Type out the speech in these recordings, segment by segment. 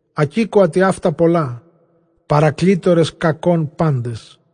Ἀκήκοα τοιαῦτα πολλὰ, παρακλήτορες κακῶν πάντες.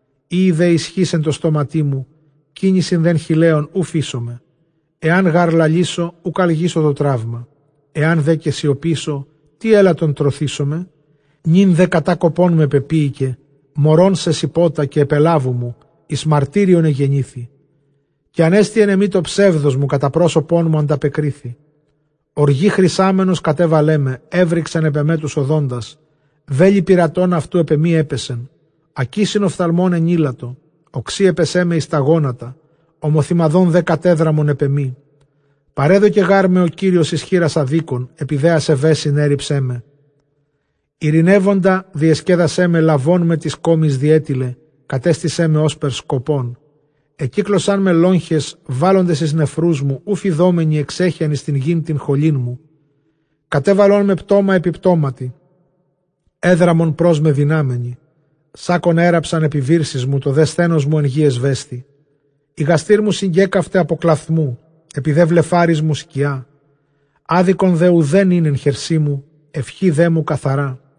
Εἴη δὲ ἰσχὺς ἐν τῷ στόματί μου, κίνησιν δὲ χειλέων οὐ φείσομαι. Ἐὰν γὰρ λαλήσω, οὐκ ἀλγήσω τὸ τραῦμα· ἐὰν δὲ καὶ σιωπήσω, τί ἔλαττον τρωθήσομαι; Νῦν δὲ κατάκοπόν με πεποίηκε μωρὸν σεσηπότα, καὶ ἐπελάβου μου. Εἰς μαρτύριον ἐγενήθη, καὶ ἀνέστη ἐν ἐμοὶ τὸ ψεῦδός μου, κατὰ πρόσωπόν μου ἀνταπεκρίθη. Ὀργῇ χρησάμενος κατέβαλέ με, ἔβρυξεν ἐπʼ ἐμὲ τοὺς ὀδόντας, βέλη πειρατῶν αὐτοῦ ἐπʼ ἐμοὶ ἔπεσαν. Ἀκίσιν ὀφθαλμῶν ἐνήλατο, ὀξεῖ ἔπαισέ με εἰς τὰ γόνατα, ὁμοθυμαδὸν δὲ κατέδραμον ἐπʼ ἐμοί. Παρέδωκε γάρ με ὁ Κύριος εἰς χείρας ἀδίκων, ἐπὶ δὲ ἀσεβέσιν ἔῤῥιψέ με. Εἰρηνεύοντα διεσκέδασέ με· λαβών με τῆς κόμης διέτιλε, κατέστησέ με ὥσπερ σκοπόν. Ἐκύκλωσάν με λόγχαις βάλλοντες εἰς νεφρούς μου, οὐ φειδόμενοι ἐξέχεαν εἰς τὴν γῆν τὴν χολήν μου· Κατέβαλόν με πτῶμα ἐπὶ πτώματι, ἔδραμον πρὸς μὲ δυνάμενοι. Σάκκον ἔῤῥαψαν ἐπὶ βύρσης μου, τὸ δὲ σθένος μου ἐν γῇ ἐσβέσθη. Ἡ γαστήρ μου συγκέκαυται ἀπὸ κλαυθμοῦ, ἐπὶ δὲ βλεφάροις μου σκιά. Ἄδικον δὲ οὐδὲν ἦν ἐν χερσί μου, εὐχὴ δέ μου καθαρά.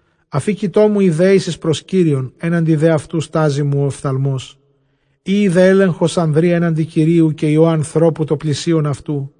Ἀφίκοιτό μου ἡ δέησις πρὸς Κύριον, ἔναντι δὲ αὐτοῦ στάζοι μου ὁ ὀφθαλμός. Εἴη δὲ ἔλεγχος ἀνδρὶ ἔναντι Κυρίου, καὶ υἱῷ ἀνθρώπου τῷ πλησίον αὐτοῦ.